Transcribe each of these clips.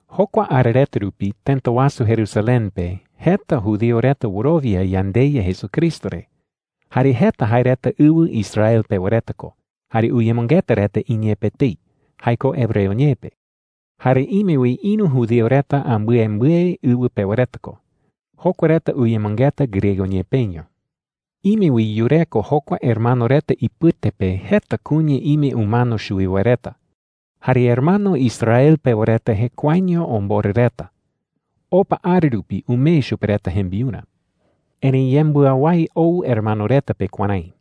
Jokua ara reta rupi tëta wasu Jerusalén pe jeta judío reta wɨrowia yandeYa Jesucristo re. Jare jeta jae reta ɨwɨ Israel pewa reta ko, jare uyemɨngeta reta iñee pe etei – jae ko hebreo ñee pe. Jare ime wi ïru judío reta ambɨembɨe ɨwɨ pewa reta ko. Jokua reta uyemɨngeta griego ñee peño. Ime wi yureko jokua hermano reta ipɨte pe jeta kuña ime umano chuwi wae reta. Jare hermano Israel pewa reta jekuaeño omborɨ reta. Opa ara rupi umee chupe reta jembiurä. Erëi yembɨawái ou hermano reta pe kuärái: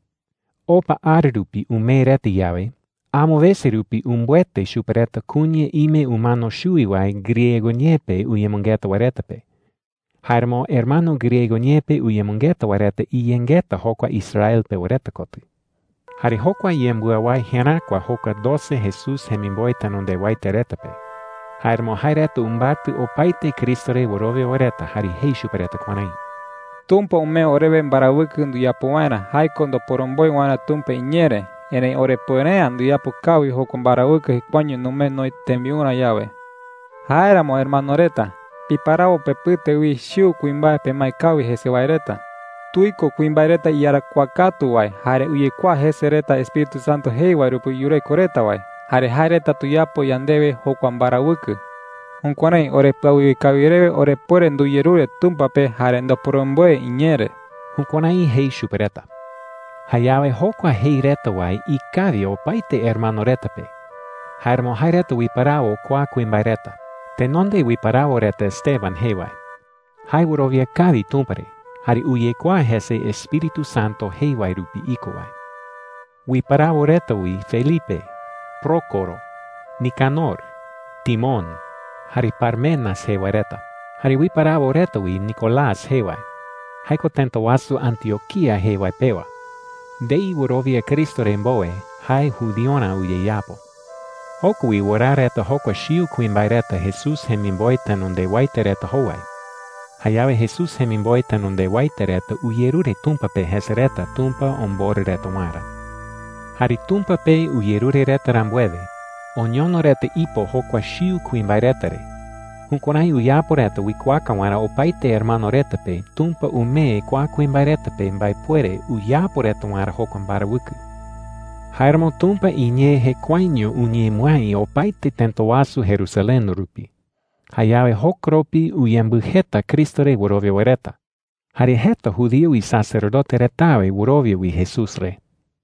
Opa ara rupi umee reta yawe, amo wese rupi umbɨete chupe reta kuña ime umano chuwi wae griego ñee pe uyemɨngeta wae reta pe. Jáeramo hermano griego ñee pe uyemɨngeta wae reta iyengeta jokua Israel pewa reta kotɨ. Jare jokua yembɨawái jeräkua jokua doce Jesús jemimboe tenondewaete reta pe. Jáeramo jae reta umbatɨ opaete Cristo re wɨrowia wae reta jare jei chupe reta kuärái: “Tumpa umee orewe mbarawɨkɨ nduyapo waerä – jae ko ndoporomboe waerä Tumpa iñee re. Erëi orepuere’ä nduyapo kawi jokua mbarawɨkɨ jekuaeño numee noï tembiurä yawe,” jei reta. “Jáeramo hermano reta, piparawo pepɨte wi chiu kuimbae pemae kawi jese wae reta,” jei. “Tuiko kuimbae reta iyarakuaa katu wae jare uyekuaa jese reta Espíritu Santo jei wae rupi yureko reta wae. Jare jae reta tuyapo yandewe jokua mbarawɨkɨ,” jei. “Jukuärái orepɨawiwe kawi rewe orepuere nduyerure Tumpa pe jare ndoporomboe iñee re.” Jukuärái jei chupe reta. Jayawe jokua jei reta wae ikawi opaete hermano reta pe. Jáeramo jae reta uiparawo kua kuimbae reta: Tenonde uiparawo reta Esteban jee wae. Jae wɨrowia kawi Tumpa re jare uyekuaa jese Espíritu Santo jei wae rupi iko wae. Uiparawo reta wi Felipe, Prócoro, Nicanor, Timón, jare Parmenas jee wae reta. Jare uiparawo reta wi Nicolás jee wae – jae ko tëta wasu Antioquía jee wae pewa. Ndei wɨrowia Cristo re mbowe, jae judiorä uyeyapo. Joko wi wɨraa reta jokua chiu kuimbae reta Jesús jemimboe tenondewaete reta jowai. Jayawe Jesús jemimboe tenondewaete reta uyerure Tumpa pe jese reta Tumpa omborɨ reta waerä. Jare Tumpa pe uyerure reta rambuewe, oñono reta ipo jokua chiu kuimbae reta re. Jukuärái uyapo reta uikuaaka waerä opaete hermano reta pe Tumpa umee kua kuimbae reta pe mbaepuere uyapo reta waerä jokua mbarawɨkɨ. Jáeramo Tumpa iñee jekuaeño uñemɨái opaete tëta wasu Jerusalén rupi. Jayawe jokoropi uyembɨjeta Cristo re wɨrowia wae reta. Jare jeta judío isacerdote retawe wɨrowia wi Jesús re.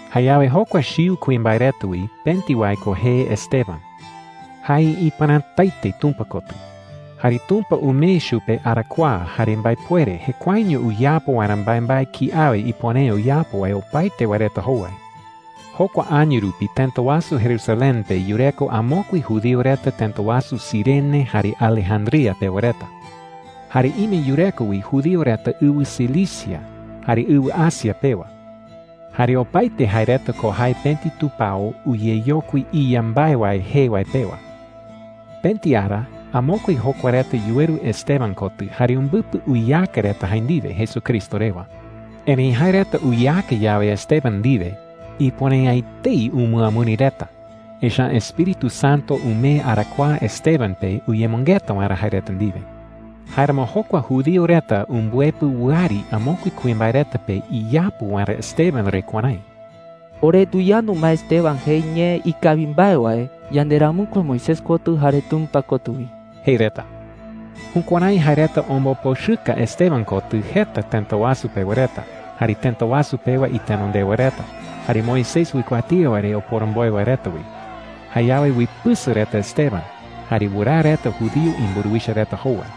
Jayawe jokua chiu kuimbae reta wi pëti wae ko jee Esteban. Jae ipɨrätaete Tumpa kotɨ. Jare Tumpa umee chupe arakuaa jare mbaepuere jekuaeño uyapo waerä mbaembae kiawe ipuere’ä uyapo wae opaete wae reta jowai. Jokua año rupi tëta wasu Jerusalén pe yureko amokue judío reta tëta wasu Cirene jare Alejandría pewa reta. Jare ime yureko wi judío reta ɨwɨ Cilicia jare ɨwɨ Asia pewa. Jare opaete jae reta ko jae pëti tupao “Uyeyokui Iya Mbae Wae” jee wae pewa. Pëti ara amokue jokua reta yuweru Esteban kotɨ jare umbɨpɨ uyeaka reta jae ndiwe Jesucristo rewa. Erëi jae reta uyeaka yawe Esteban ndiwe, ipuere’ä etei umɨamɨri reta, echa’ä Espíritu Santo umee arakuaa Esteban pe uyemɨngeta waerä jae reta ndiwe. Jáeramo jokua judío reta umbɨepɨ wɨari amokue kuimbae reta pe iyapu waerä Esteban re kuärái: “Ore nduyandu ma Esteban jei ñee ikawi mbae wae yanderamɨkue Moisés kotɨ jare Tumpa kotɨ wi,” jei reta. Jukuärái jae reta ombopochɨka Esteban kotɨ jeta tëta wasu pewa reta, jare tëta wasu pewa itenondewa reta, jare Moisés uikuatía wae re oporomboe wae reta wi. Jayawe uipɨsɨ reta Esteban, jare wɨraa reta judío imburuwicha reta jowai.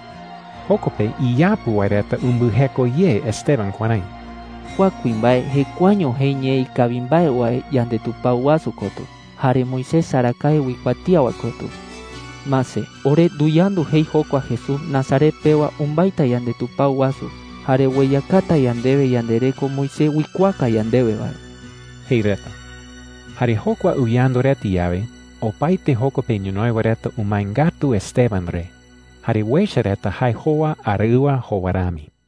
Joko pe iyapu wae reta umbɨjeko ye Esteban kuärái: “Kua kuimbae jekuaeño jei ñee ikawi mbae wae yandetupao wasu kotɨ jare Moisés arakae uikuatía wae kotɨ,” jei reta. “Mase, ore nduyandu jei jokua Jesús Nazaret pewa umbaita yandetupao wasu jare ueyakata yandewe yandereko Moisés uikuaaka yandewe wae,” jei reta. Jare jokua uyandu reta yawe, opaete joko pe ñonoï wae reta umae ngatu Esteban re. Jare uecha reta jae jowa araɨwa jowa rami.